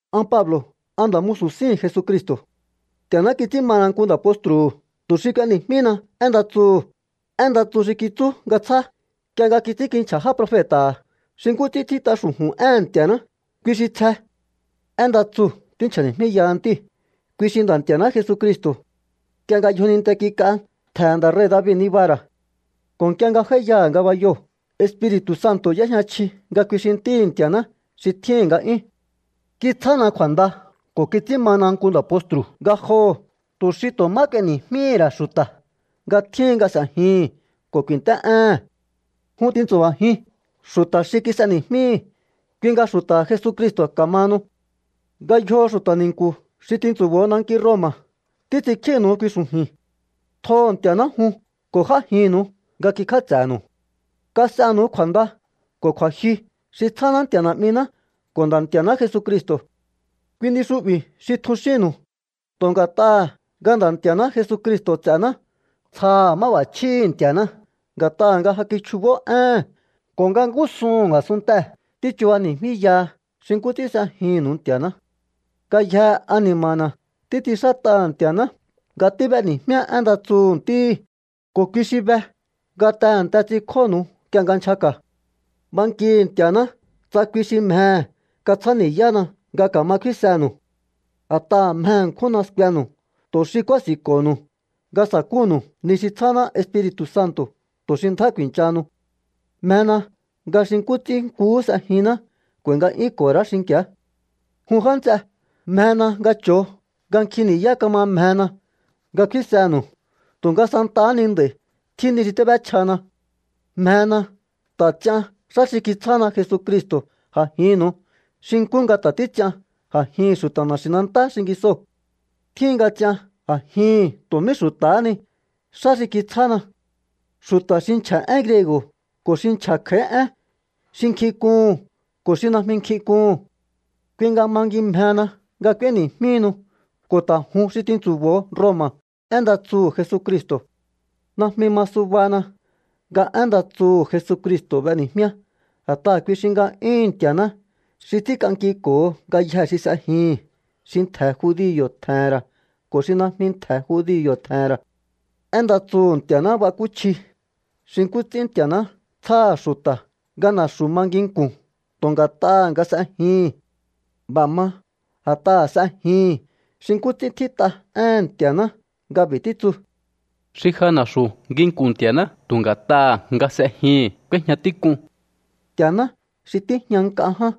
An Pablo̱, an nda̱ musu̱ síhi̱n Jesucristo̱. Nti̱a̱ná kits'ín mana nku nda̱ postru̱hu̱ tu̱ xi k'ueni̱jmíhina én nda tsuhu̱, én nda tsu xi kitsú nga tsjá nk'ie nga kits'ínkinchja̱ já profeta̱ha̱ xi nkú ts'ín tjít'a xu̱ju̱n éhe̱n Nti̱a̱ná, kui xi tsje. Én nda tsuu̱ tínchja̱ni̱jmíyaha Ntíhi̱, kui xi Nda̱ Nti̱a̱ná Jesucristo̱. Nk'ie nga yjoninte kik'a, ntje̱he̱ nda̱ rei̱ David nibaha̱ ra̱. Ko̱ nk'ie nga j'áíyaha̱ ngabayoo̱, Espiri̱tu̱ Santo̱ y'éjña chji nga kui xi Ntíhi̱ Nti̱a̱ná xi tjíhi̱n nga'yún. Kitsjána kju̱a̱nda ko̱ kits'ín mana nku nda̱ postru̱ ngajoho̱ tu̱ xi tu̱ má k'ueni̱jmíhi̱ ra̱ xu̱ta̱ nga tjíhin nga s'e̱jihi̱n ko̱ ku̱i̱nt'é'éhe̱n. Jun tintsu̱ba̱jiun xu̱ta̱ xi kis'eni̱jmíhi̱, kui nga xu̱ta̱ha̱ Jesucristo̱ ka̱mahanu. Ngayjoo̱ xu̱ta̱ ni̱nku̱ xi tintsu̱bo̱o nanki Roma̱ títs'inkjínu̱u kui xu̱ju̱i̱n. Tjoho̱ Nti̱a̱ná jun ko̱ j'ájinnu̱u nga kikjáts'e̱nu̱u. Kas'enu̱u kju̱a̱nda ko̱ kju̱a̱jyu xi tsjáná Nti̱a̱ Na̱'miná ko̱ Nda̱ Nti̱a̱ná Jesucristo̱. Kui ni xu'bi̱ xi tjun xínnu̱u. Tu̱ nga̱t'aha̱ nga Nda̱ Nti̱a̱ná Jesucristo̱ ts'e̱ná, tsjaha̱ máb'a̱chjíhi̱ Nti̱a̱ná nga̱t'aha̱ nga ja kichjubó éhe̱n ko̱ nga ngúsuhu̱n a̱sunntee̱ tíchubani̱jmíyaha xi nkú ts'ín s'ejinnu̱u Nti̱a̱ná. Ngayjee̱ ani̱ma̱na̱ títs'inxát'aha̱ Nti̱a̱ná nga tíb'eni̱jmíá én nda tsuhu̱ Ntíhi̱, ko̱ kui xi be nga tehe̱nte ts'inkjónu̱u nk'ie nga nchjaka̱. Bankihi̱ Nti̱a̱ná tsa kui xi mjehe̱ katsjáni̱yána nga ka̱ma kfínsenu̱u. A̱t'aha̱ mje ṉkjúnna skuenu̱u tu̱ xi kúási̱nko̱ho̱nu̱u nga sa̱kúnu̱u ni xi tsjáná Espiri̱tu̱ Santo̱, tu̱ xi ndjá ku̱i̱nchahanu. Mjena nga xi nkú ts'ín nkuhú s'ejinná k'u̱a̱i̱ nga'yúnko̱ho̱ ra̱á xinki̱á. Jun já nts'e, mjena nga cho̱o nga nkjin ni̱yá kama mjena nga kfínsenu̱u tu̱nga santahá ni nd'a̱i̱ tjín ni xi tíb'échjana. Mjena ta̱ ts'ian xá xi kitsjána Jesucristo̱ a̱jinnu̱u xi nkú nga ta̱ títs'ian a̱jihi̱n xu̱ta̱ na̱xi̱nantá xingisoo̱. Tjíhin nga ts'ian a̱jihi̱n tu̱ mí xu̱ta̱há ni xá xi kitsjána, xu̱ta̱ xi nchja̱ én griego̱ ko̱ xi nchja̱ kj'a̱í én, xi nkjink'uhu̱n ko̱ xi najmi nkjink'uhu̱n. Kui nga mangimjehena nga k'ueni̱jmíhi̱nu̱u ko̱ ta̱ jun xi tintsu̱bo̱o Roma̱ én nda tsuhu̱ Jesucristo̱. Najmi ma subana nga én nda tsuhu̱ Jesucristo̱ b'eni̱jmíá, a̱t'aha̱ kui xi nga'yúhu̱n Nti̱a̱ná xi ts'ínk'ankiko̱ho ngayjee̱ xi s'e̱jihi̱n, xi ntje̱ judio̱ tje̱he̱n ra̱ ko̱ xi najmi ntje̱ judio̱ tje̱he̱n ra̱. Én nda tsuhu̱ Nti̱a̱ná bakúchji xi nkú ts'ín Nti̱a̱ná tsjáha̱ xu̱ta̱ nga na̱xu̱ ma nginku̱n tu̱ nga̱t'aha̱ nga s'ejihi̱n. B'a̱ ma a̱t'aha̱ s'ejihi̱n, xi nkú ts'ín tjít'a éhe̱n Nti̱a̱ná nga b'i̱ títsu: “Xi ja na̱xu̱ nginku̱n Nti̱a̱ná tu̱ nga̱t'aha̱ nga s'ejihi̱n k'úéjña tík'un.” Nti̱a̱ná xi tíjña nk'a ján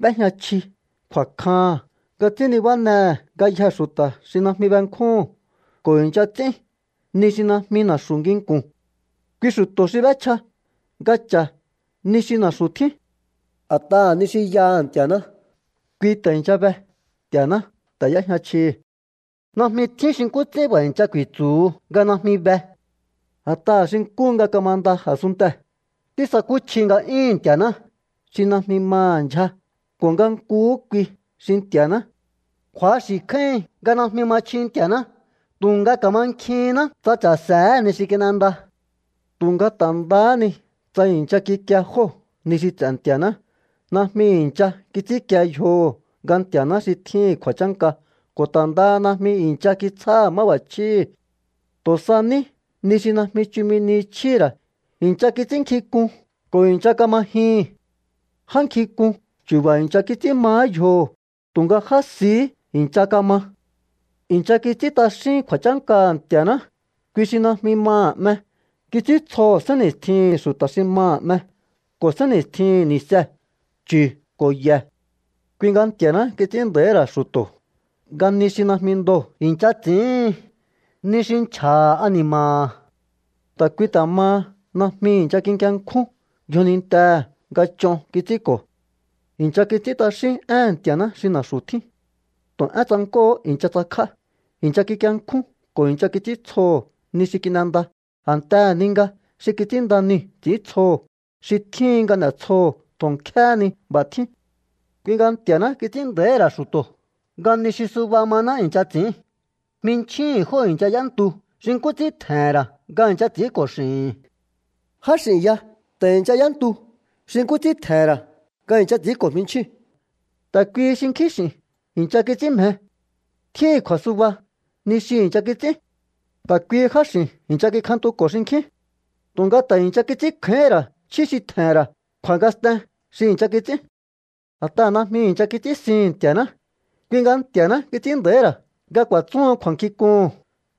b'éjña chji kju̱a̱kjaha̱n nga ts'ín nibánehe̱ ngayjee̱ xu̱ta̱ xi najmi benkjúhu̱n ko̱ i̱ncha ts'ín ni xi najmi na̱xu̱ nginku̱n. Kui xu̱to̱ xi b'échja nga cha̱ ni xi na̱xu̱ tjín. A̱t'aha̱ ni xi yaha̱ Nti̱a̱ná, kui ta̱ i̱ncha be. Nti̱a̱ná ta̱ y'éjña chjihi̱. Najmi tjín xi nkú ts'ín b'a̱ i̱ncha ku̱i̱tsu̱hu nga najmi be. A̱t'aha̱ xi nkúhu nga kamanda a̱sunntee̱ tísakúchji nga'yúhu̱n Nti̱a̱ná xi najmi maha̱ ndyja ko̱ nga nkuhú kui xi Nti̱a̱ná. Kju̱axi̱ kjáíhin nga najmi ma chji Nti̱a̱ná, tu̱nga ka̱mankjihínná tsa cha̱se̱éhe̱ ni xi kin'enda. Tu̱nga ta̱ ndahá ni tsa i̱ncha kikie jóo̱ ni xi ts'e̱ Nti̱a̱ná, najmi i̱ncha kits'ínkie yjoho̱ nga Nti̱a̱ná xi tjíhi̱n kju̱a̱chánka ko̱ ta̱ ndaha najmi i̱ncha kitsjáha̱ máb'a̱chjíhi̱. Tu̱ sa ní ni xi najmi chumi ni chjíhi̱ ra̱ i̱ncha kits'ínnkjink'un ko̱ i̱ncha kama jyihi̱n. Já nkjink'un chu̱ba̱ i̱ncha kits'ín mahá yjoho̱, tu̱nga já sihí i̱ncha kama. I̱ncha kits'ín t'axín kju̱a̱chánkaha̱ Nti̱a̱ná, kui xi najmi maha̱ 'me. Kits'íntsjoho̱ sénni̱stjihi̱n xu̱ta̱ xi maha̱ 'me ko̱ sénni̱stjihi̱n ni̱see̱, chu̱ ko̱ ye̱. Kui nga Nti̱a̱ná kits'ín nda̱íhi̱ ra̱ xu̱to̱ nga ni xi najmi ndoo̱ i̱ncha ts'i̱íhin, ni xi nchja̱ha̱ ani̱ma̱ha̱. Ta̱ kui ta̱ maha najmi i̱ncha kikienkjún yjonintehe̱ nga ch'on kits'ínko̱. I̱ncha kits'ín t'axín éhe̱n Nti̱a̱ná xi na̱xu̱ tjín. Tu̱ én tsank'óo̱hó i̱ncha tsakj'á. I̱ncha kikienkjún ko̱ i̱ncha kits'íntsjoho̱ ni xi kin'enda a̱ntehe̱ ni nga xi kits'ínnda niu̱ ts'i̱íntsjoho̱, xi tjíhin nga n'e̱tsjoho̱ tu̱ nkjéhé ni. B'a̱ tjín. Kui nga Nti̱a̱ná kits'ín nda̱íhi̱ ra̱ xu̱to̱ nga ni xi suba maná i̱ncha ts'i̱ín. Jminchjíhi̱n jóo̱ i̱ncha y'éntu xi nkú ts'ín tje̱he̱n ra̱ nga i̱ncha ts'i̱ínko̱ x'i̱hi̱n. Já x'i̱n ya ta̱ i̱ncha y'éntu xi nkú ts'ín tje̱he̱n ra̱ nga i̱ncha ts'i̱ínko̱ jmichjíu̱n. Ta̱ kuihi xinkjín x'i̱n i̱ncha kits'ín mje. Tjíhi̱n kju̱a̱suba ni xi i̱ncha kits'ín. Ta̱ kuihi jáx'i̱n i̱ncha kikjantuko̱ xinkjín. Tu̱nga ta̱ i̱ncha kits'ínkjáíhín ra̱ chjí xi tje̱he̱n ra̱ kju̱a̱ngasten xi i̱ncha kits'ín. A̱t'aha̱ najmi i̱ncha kits'ínsihi̱n Nti̱a̱ná, kui nga Nti̱a̱ná kits'ín nda̱íhi̱ ra̱ nga ku̱a̱tsúhun kju̱a̱nkjink'uhu̱n,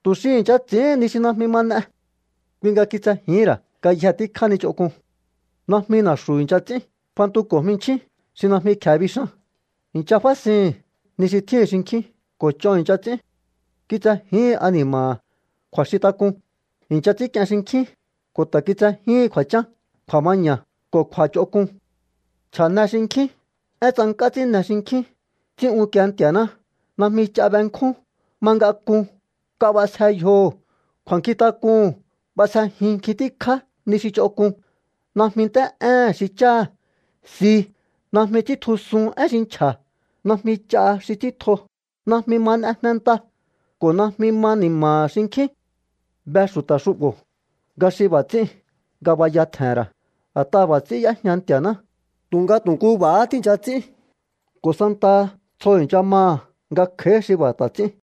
tu̱ xi i̱ncha ts'íhin ni xi najmi ma n'e. Kui nga kitsejíhi̱n ra̱ ngayje tíkjá ni ch'onk'un. Najmi na̱xu̱ i̱ncha ts'ín, fantuko̱ jminchjín xi najmi kje̱e bixan, i̱ncha fásihi̱n ni xi tjíhi̱n xinkjín ko̱ ch'on i̱ncha ts'ín. Kitsejíhin ani̱ma̱ha̱ kju̱a̱xintak'un, i̱ncha ts'i̱ínk'ien xinkjín, ko̱ ta̱ kitsejíhin kju̱a̱chán, kju̱a̱maña̱ ko̱ kju̱a̱ch'onk'un. Nchja̱ne xinkjín, én tsank'á ts'ínne xinkjín, ts'ín unkie Nti̱a̱ná, najmi ch'a benkjún, ma ngak'un, nk'a b'asje yjoho̱, kju̱a̱nkjintak'uhu̱n b'asjejin nkjin tíkjá ni xi ch'onk'un, najmi nt'é'éhe̱n xi cháha̱, si, najmi ts'íntjusun én xi nchja̱, najmi ch'a xi ts'íntjo, najmi ma n'e jnenta ko̱ najmi ma ni̱ma̱ha̱ xinkjín. Be xu̱ta̱ xu'bo̱ nga xi b'a̱ ts'íu̱n ngabaya tje̱he̱n ra̱, a̱t'aha̱ b'a̱ ts'ín y'éjña Nti̱a̱ná. Tu̱nga tu̱ nku b'a̱há tíi̱ncha ts'ín ko̱ santaha tsjo i̱ncha maha̱ nga kj'a̱í xi b'a̱ ta̱ ts'ín.